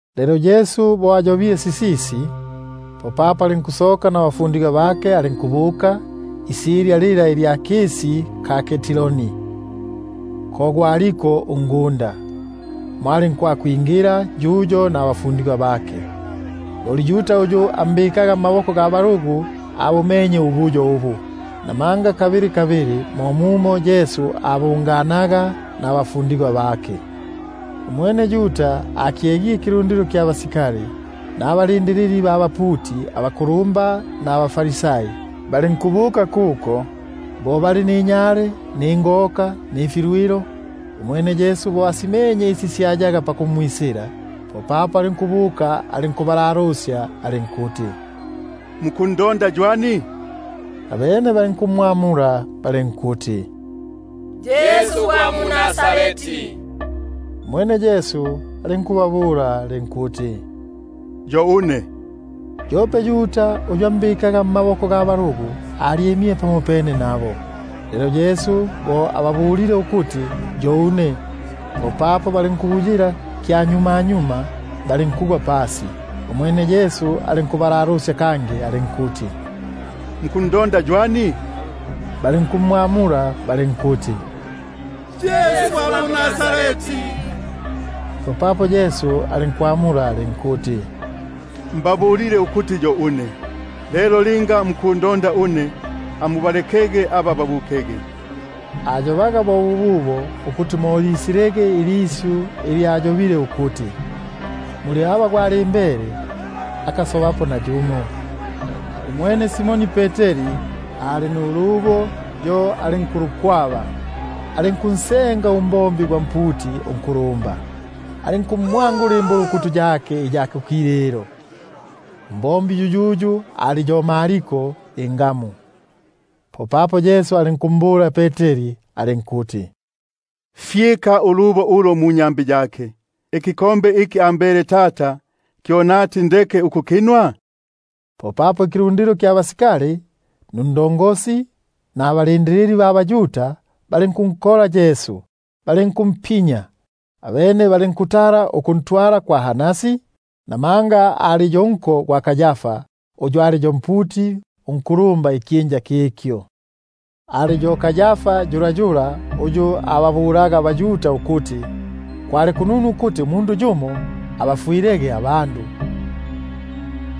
Lelo bo Yesu ayobile sisisi, popapo alinkusoka nabafundigwa bake, alinkubuka isilya lila lya mpwisi gwa Kedroni, ko gwaliko ungunda; mo alinkwakwingila yuyo nabafundigwa bake. Loli Yuda uyu ambikaga mmaboko ga balugu, abumenye ubuyo ubu, namanga mo mumo kabili kabili Yesu abunganaga nabafundigwa bake. Umwene Yuda bo akyegile ikilundilo kya basikali nababombi ba baputi abakulumba nabaFarisai, alinkubuka kuko ninyale, nifikoka, mfilwilo. Umwene Yesu bo asimenye isi syayaga pakumwisila, popapo alinkubuka alinkubalalusya alinkuti: Muku- ndonda ywani? Abene balinkumwamula balinkuti: Yesu gwa mu-Nazareti. Umwene Yesu alinkubabula alinkuti: Yo une. Yope Yuda uyu ambikaga mmaboko ga balugu, yo alyimile pamopene nabo. Lelo umwene bo ababulile ukuti: Yo une, popapo balinkubuyila kyanyumanyuma, balinkugwa pasi. Umwene alinkubalalusya kangi alinkuti: Mukundonda ywani? Abene balinkuti: Yesu ugwa mu-Nazareti. Popapo Yesu alinkwamula alinkuti: Mbabulile ukuti yo une. Lelo linga mukundonda une, amubalekege aba babukege; — ukuti mo lisilege ilisyu ili ayobile ukuti: Muli aba gwalimbele, akasobapo nayumo —. Umwene Simoni Peteri ali nulubo, yo alinkulukwaba, alinkunsenga untumwa gwa mputi unkulumba, alinkumwangula imbulukutu yake iya kukililo; untumwa yuyuyu ali yo Malko ingamu. Popapo Yesu alinkumbula Peteri alinkuti: Fyika ulubo ulo munyambi yake; ikinwelo iki ambele Tata, kyo nati ndeke ukukinwa? Popapo ikilundilo kya basikali, nundongosi, nababombi ba baYuda balinkunkola Yesu balinkumpinya; abene balinkutala ukuntwala kwa Hanasi, namanga ali yo nko gwa Kayafa uyu ali yo mputi unkulumba ikyinja kikyo. Ali yo yu Kayafa uyu ababulaga abaYuda ukuti: Kwali kununu ukuti umundu yumo abafwilege abandu.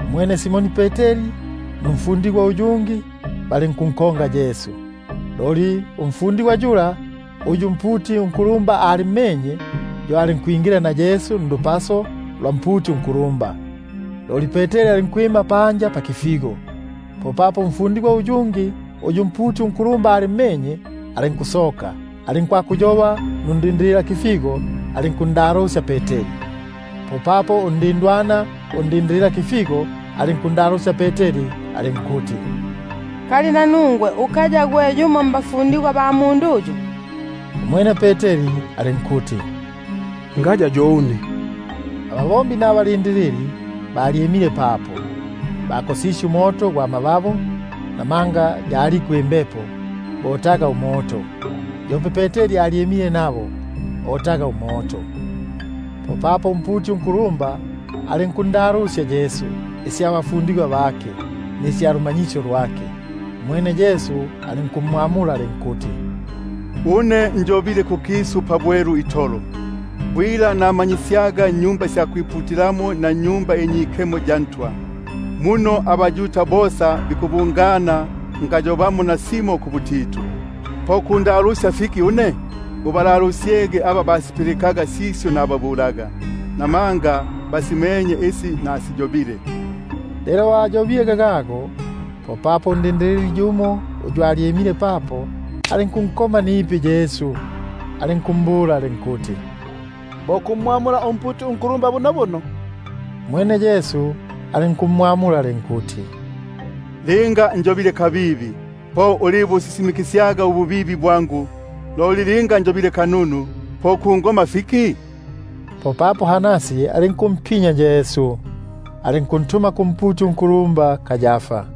Umwene Simoni Peteri numfundigwa uyungi balinkunkonga Yesu. Loli umfundigwa yula, uyu umputi unkulumba alimmenye, yo alinkwingila na Yesu ndupaso lwa mputi unkulumba; loli Peteri alinkwima panja pakifigo. Popapo umfundigwa uyungi uyu umputi unkulumba alimmenye, alinkusoka, alinkwakuyoba nundindililakifigo; alinkumwingisya Peteri. Popapo undindwana undindililakifigo alinkundalusya Peteri alinkuti: Ngimba nanungwe ukaya gwe yumo mbafundigwa ba mundu uyu? Umwene alinkuti: Ngaya yo une. Abatumwa nababombi balyimile papo, bakosisye umoto gwa mababu, namanga yaliko imbepo, botaga umoto; yope Peteri alyimile nabo, otaga umoto. Popapo umputi unkulumba alinkundalusya Yesu isya bafundigwa bake, nisya lumanyisyo lwake. Umwene Yesu alinkumwamula alinkuti: Une njobile kukisu pabwelu itolo; bwila namanyisyaga mu-Sinagogi na mwa Tempeli, muno abaYuda bosa bikubungana ngayobamo nasimo kubutitu. Po kundalusya fiki? Ubalalusyege aba basipilikaga sisyo nababulaga, buno basimenye isi nasiyobile. Lelo bo ayobile lilili, popapo umbombi yumo uyu alyimile papo, alinkunkoma nipi Yesu, alinkumbula alinkuti: Bo kumwamula umputi unkulumba bunobuno? Umwene Yesu alinkumwamula alinkuti: Linga njobile kabibi, po ulibusisimikisyaga ububibi bwangu; loli linga njobile kanunu, po kungoma fiki? Popapo Hanasi alinkumpinya, alinkuntuma kumputi unkulumba Kayafa.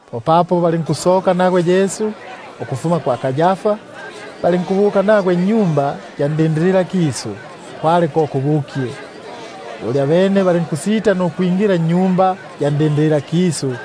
Popapo balinkusoka nagwe Yesu kwa Kayafa, balinkubuka nagwe nnyumba ya bulindililakisu; kwali ko kubukye. Loli abene balinkusita nukwingila nnyumba ya bulindililakisu,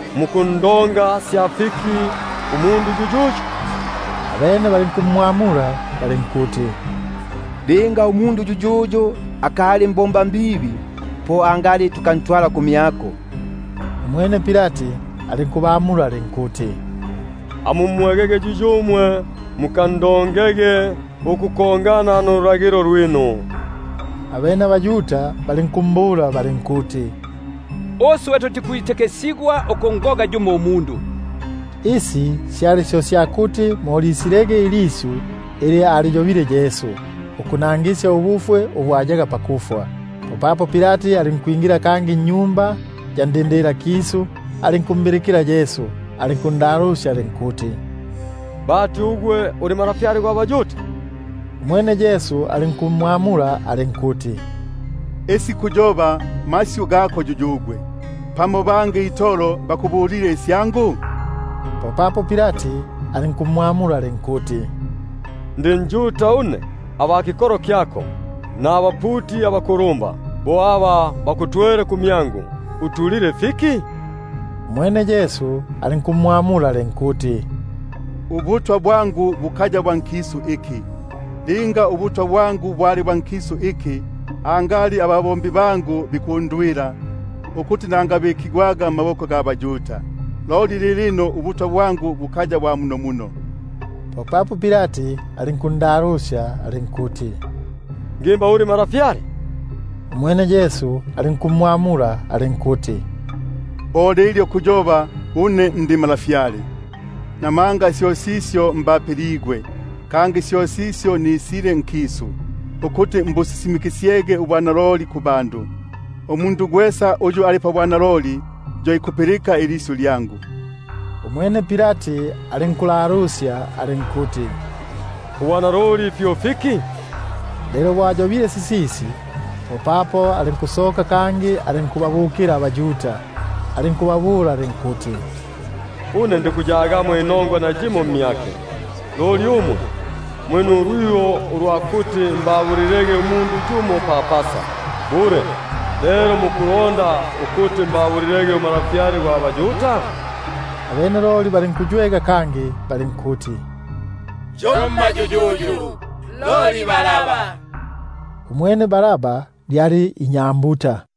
Mukundonga sya fiki umundu yuyuyu? Abene balinkumwamula balinkuti: Linga umundu yuyuyu akali mbombambibi, po angali tukantwala kumyako. Umwene Pilati alinkubamula alinkuti: Amumwegege yuyumwe, mukandongege ukufwana nululagilo lwinu. Abene abaYuda balinkumbula balinkuti: Uswe tutikwitikisigwa ukungoga yumo umundu; — ukuti mo lisilege ilisyu ili aliyobile Yesu, ukunangisya ubufwe ubu ayaga pakufwa —. Popapo Pilati alinkwingila kangi nnyumba ya bulindililakisu, alinkumbilikila Yesu, alinkundalusya alinkuti: Bati ugwe uli Ntwa gwa baYuda? Umwene Yesu alinkwamula alinkuti: Syo kuyoba sisisi gwimwene, pamo bangi itolo aba bakubulile isyangu? Popapo Pilati alinkumwamula alinkuti: Ndi njuta une? Aba kikolo kyako, nabaputi abakulumba, bo aba bakutwele kumyangu, utulile fiki? Umwene Yesu alinkumwamula alinkuti: Ubutwa bwangu bukaya bwa nkisu iki. Linga ubutwa bwangu bwali bwa nkisu iki, angali ababombi bangu bikundwila, ukuti nangabikigwaga mmaboko ga ba-Yuda; loli lilino, ubutwa bwangu bukaya bwa munomuno. Popapo Pilati alinkundalusya alinkuti: Ngimba uli Ntwa lelo? Umwene Yesu alinkumwamula alinkuti: Bo lilyo kuyoba; une ndi Ntwa. Buno syo sisyo mbapiligwe, kangi syo sisyo nisile nkisu, ukuti mbusisimikisyege ubwanaloli. Gwesa uyu ali pabwanaloli, yo ikulipilika ilisyu lyangu. Umwene Pilati alinkulalusya alinkuti: Ubwanaloli fyo fiki? Lelo bo ayobile sisisi, popapo alinkusoka kangi, alinkubuka kubaYuda, alinkubabula alinkuti: Une ndikuyagamo nayimo inongwa mmyake. Loli muli nulwiho lwa kuti mbabulilege umundu yumo pa Pasa. Bule lelo mukulonda ukuti mbabu- lilege uNtwa gwa baYuda? Abene loli balinkuywega kangi balinkuti: Yomma yuyuyu, loli Baraba. (Umwene Baraba lyali inyambuta.)